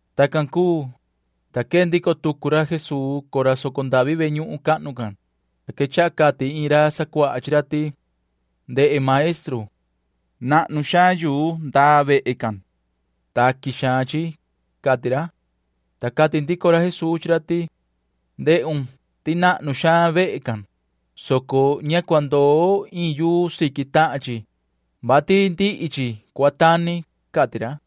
Tacan cuu, ta quee ndico tucu ra Jesuu cora soco ndavi ve ñuhun cahnu can, ta quechaha cati iin ra sacuaha chi ra ti: ―Ndehe, maestru. Nahnu xaan yuu ndaa vehe can. Taqui xaan chi ―cati ra. Ta cati ndico ra Jesuu chi ra ti: ―Ndehun ti nahnu xaan vehe can, soco ña cua ndoo iin yuu siqui tahan chi, vati ndihi chi cua tani ―cati ra.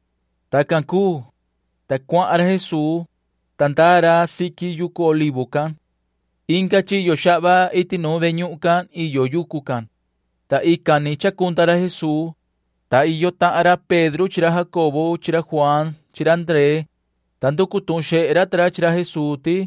Tacan cuu, [ta cuahan ra Jesuu, ta ndaa ra siqui yucu Olivo can]. Inga chiyo xahva iti nuun ve ñuhun can iyo yucu can, ta ican ni chacunda ra Jesuu, ta iyo tahan ra Pedro chi ra Jacobo chi ra Juaan chi ra Ndree, ta nducu tuhun xehe ra ta ra chi ra Jesuu ti: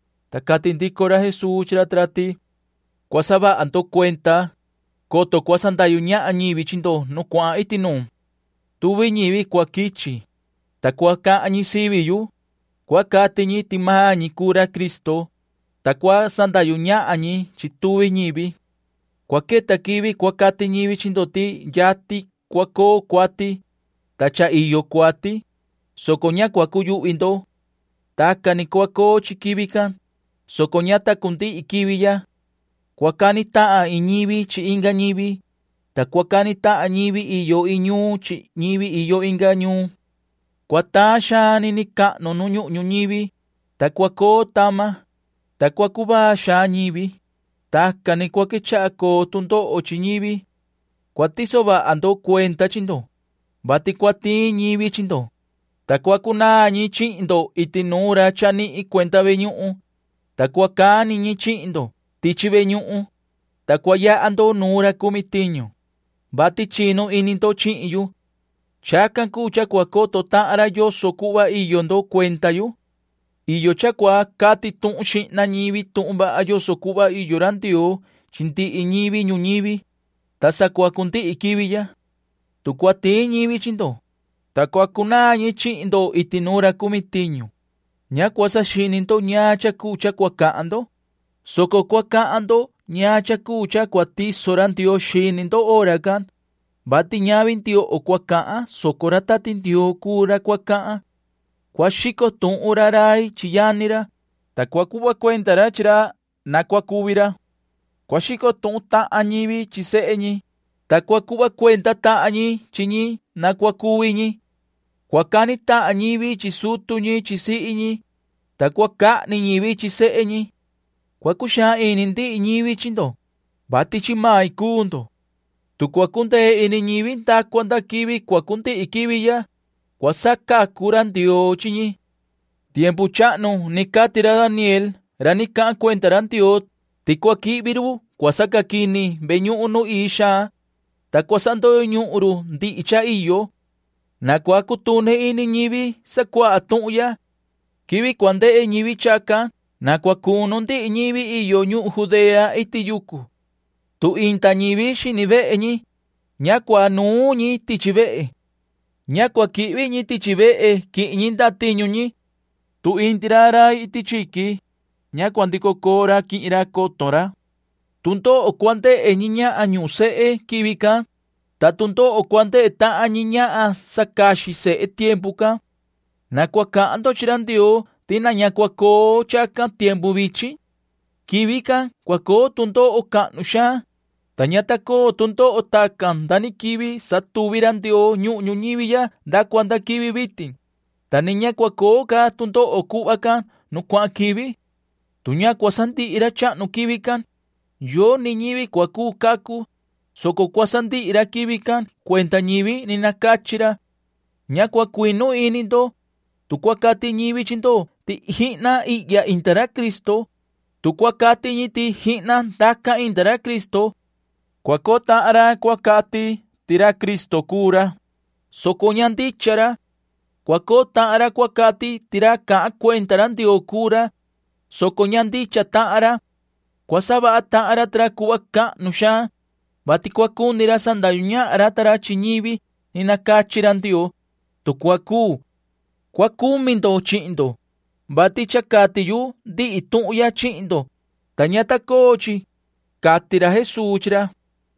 Ta cati ndico ra Jesuu chi ra ta ra ti: ―Cua saha ndo cuenda, coto cua sandahyu ñahan ñivi chi ndo nu cuahan iti nuun. Tuvi ñivi cua quichi, ta cua cahan ñi sivi yu, ta cua cati ñi ti maan ñi cuu ra Cristo, ta cua sandahyu ñahan ñi chi tuvi ñivi. ’Cua queta quivi cua cati ñivi chi ndo ti yatin cua coo cuati, ta cha iyo cuati, soco ña cua cuyuhvi ndo. Tacan ni cua coo chi quivi can, soco ña ta cundihi quivi ya. Cua cani tahan iin ñivi chi inga ñivi, ta cua cani tahan ñivi iyo iin ñuun chi ñivi iyo inga ñuun. Cua taan xaan nini cahnu nu ñuhun ñuñivi, ta cua coo tama, ta cua cuvaa xaan ñivi. Tacan ni cua quechaha coo tu ndoho chi ñivi. ’Cua tiso vaha ndo cuenda chi ndo, vati cua tiin ñivi chi ndo, ta cua cunaan ñi chihin ndo iti nuun ra chanihin cuenda ve ñuhun, ta cua cani ñi chihin ndo tichi ve ñuhun, ta cua yaha ndo nuun ra cumi tiñu, vati chinu ini ndo chihin yu. Chacan cuu cha cua coto tahan ra yoso cuhva iyo ndo cuenda yu. Iyo cha cua cati tuhun xihna ñivi tuhun vaha yoso cuhva iyo ra Ndioo chi ndihi ñivi ñuñivi, ta sa cua cundihi quivi ya. Tu cua tiin ñivi chi ndo, ta cua cunaan ñi chihin ndo iti nuun ra cumi tiñu, ña cua saxini ndo ñaan cha cuu cha cua cahan ndo, soco cua cahan ndo ñaan cha cuu cha cua tiso ra Ndioo xini ndo hora can, vati ñavi ndioho cua cahan, soco ra Tati Ndioo cuu ra cua cahan. Cua xico tuhun ra rai chi yani ra, ta cua cuhva cuenda ra chi ra na cua cuvi ra. Cua xico tuhun tahan ñivi chi sehe ñi, ta cua cuhva cuenda tahan ñi chi ñi na cua cuvi ñi. Cua cani tahan ñivi chi sutu ñi chi sihi ñi, ta cua cahni ñivi chi sehe ñi. Cua cuxaan ini ndihi ñivi chi ndo, vati chi main cuu ndo. Tu cua cundee ñivi nda cua nda cua cundihi quivi ya, cua sacacu ra Ndioo chi ñi. ’Tiempu chahnu cha ni cati ra Daniel ra ni cahan cuenda ra Ndioo ti cua quihvi run cua sacaquini ve ñuhun nu ii xaan, ta cua sandoyo ñuhun run ndihi cha iyo. Na cua cutuni ini ñivi sacuaha tuhun ya. Quivi cua ndehe ñivi chacan na cua cunu ndihi ñivi iyo ñuhun Judea iti yucu. Tu inda ñivi xini vehe ñi, ña cua nuun ñi tichi vehe. Ña cua quihvi ñi tichi vehe quihin ñi ndatiñu ñi. Tu inda ra rai iti chiqui, ña cua ndico coo ra quihin ra coton ra. Tu ndoho cua ndehe ñi ñahan ñuhun sehe quivi can, ta tu ndoho cua ndehe tahan ñi ñahan sacaxi sehe tiempu can. Na cua cahan ndo chi ra Ndioo ti na ña cua coo chacan tiempu vichin. Quivi can cua coo tu ndoho cahnu xaan, ta ña ta coo tu ndoho tacan nda ni quivi satuvi ra Ndioo ñuhun ñuñivi ya nda cua nda quivi vitin, ta ni ña cua coo ca tu ndoho cuhva can nu cuahan quivi. Tu ña cua sandihi ra chahnu quivi can, yoni ñivi cua cacu, soco cua sandihi ra quivi can cuenda ñivi ni nacachi ra. ’Ña cua cuinu ini ndo, tu cua cati ñivi chi ndo ti jihna ihya inda ra Cristo, tu cua cati ñi ti jihna ndacan inda ra Cristo. Cua coo tahan ra cua cati ti ra Cristo cuu ra, soco ña ndicha ra. Cua coo tahan ra cua cati ti ra cahan cuenda ra Ndioo cuu ra, soco ña ndicha tahan ra. Cua savaha tahan ra ta ra cuhva cahnu xaan, vati cua cuni ra sandahyu ñahan ra ta ra chi ñivi ni nacachi ra Ndioo, tu cua cuu. Cua cumi ndo chihin ndo, vati cha cati yu ndihi tuhun ya chihin ndo, ta ña ta coo chi ―cati ra Jesuu chi ra.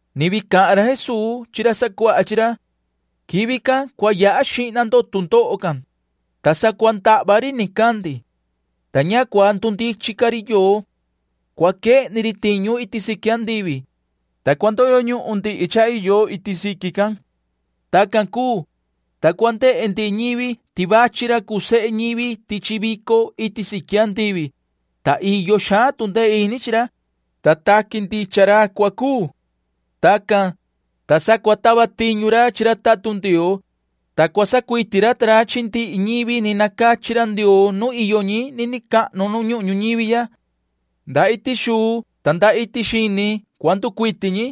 [Ni vii cahan ra Jesuu chi ra sacuaha chi ra:] ’Quivi can cua yaha xihna tu ndoho can, ta sa cua ndahva ri nicandi, ta ña cua ndundichin ca ri yoo. Cua quehni ri tiñu iti siqui andivi, ta cua ndoyo ñuhun ndihi cha iyo iti siqui can. Tacan cuu, ta cua ndehe ndihi ñivi ti vachi ra cuu sehe ñivi tichi vico iti siqui andivi, ta iyo xaan tu ndee ini chi ra, ta taqui ndicha ra cua cuu. Tacan, ta sa cua tava tiñu ra chi ra tatun Ndioo, ta cua sacuiti ra ta ra chi ndihi ñivi ni nacachi ra Ndioo nu iyo ñi nini cahnu nu ñuhun ñuñivi ya. Nda iti xuu ta nda iti xini cua nducuiti ñi.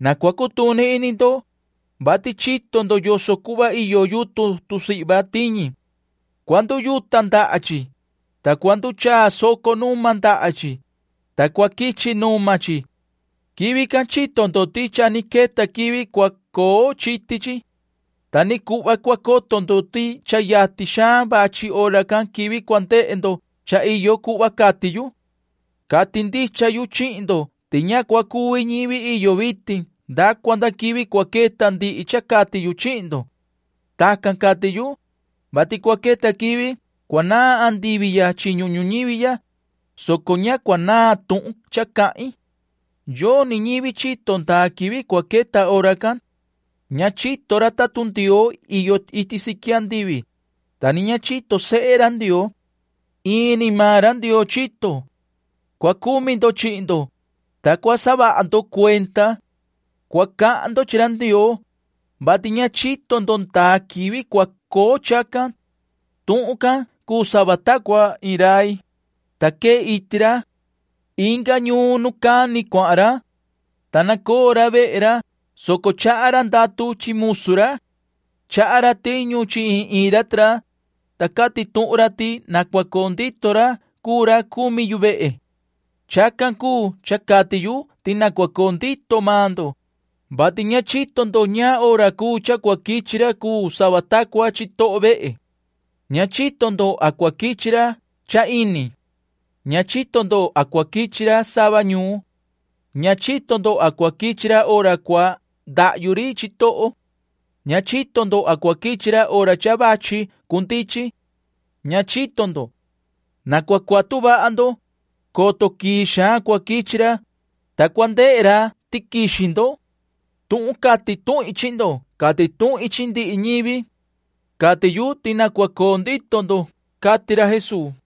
’Na cua cutuni ini ndo, vati chito ndo yoso cuhva iyo yutun tusihva tiñi. Cua nduyuta ndaha chi, ta cua nduchaa soco numa ndaha chi, ta cua quichi numa chi. Quivi can chito ndo ti cha ni queta quivi cua coo chiti chi. Ta ni cuhva cua coto ndo ti cha yatin xaan vachi hora can quivi cua ndehe ndo cha iyo chi cuhva cati yu. Cati ndicha yu chihin ndo ti ña cua cuvi ñivi iyo vitin nda cua nda quivi cua queta ndihi cha cati yu chihin ndo. [Tacan cati yu,] vati cua queta quivi cua naan andivi ya chi ñuhun ñuñivi ya, soco ña cua naan tuhun cha cahin. ’Yoni ñivi chito ndaa quivi cua queta hora can. Ña chito ra tatun Ndioo iyo iti siqui andivi, ta ni ña chito sehe ra Ndioo. Ini maan ra Ndioo chito. ’Cua cumi ndo chihin ndo, ta cua saha ndo cuenda. Cua cahan ndo chi ra Ndioo, vati ña chito ndo ndaa quivi cua coo chacan. Tuhun can cuu sava ta cua iin rai, ta quee iti ra. Inga ñuun nu cani cuahan ra, ta nacoo ra vehe ra, soco chaha ra ndatu chi musu ra. Chaha ra tiñu chi iin iin ra ta ra, ta cati tuhun ra ti na cua coo ndito ra cuu ra cumi yu vehe. Chacan cuu cha cati yu ti na cua coo ndito maan ndo, vati ña chito ndo ñaan hora cuu cha cua quichi ra cuu sava ta cua chitoho vehe. Ña chito ndo a cua quichi ra cha cha ini. Ña chito ndo a cua quichi ra sava ñuun. Ña chito ndo a cua quichi ra hora cua ndahyu ri chitoho. Ña chito ndo a cua quichi ra hora cha vachi cundichin. Ña chito ndo. Na cua cuatu vaha ndo, coto quii xaan cua quichi ra, ta cua ndehe ra ti quixi ndo. Tuhun cati tuhin chi ndo cati tuhin chi ndihi ñivi. Cati yu ti na cua coo ndito ndo ―cati ra Jesuu.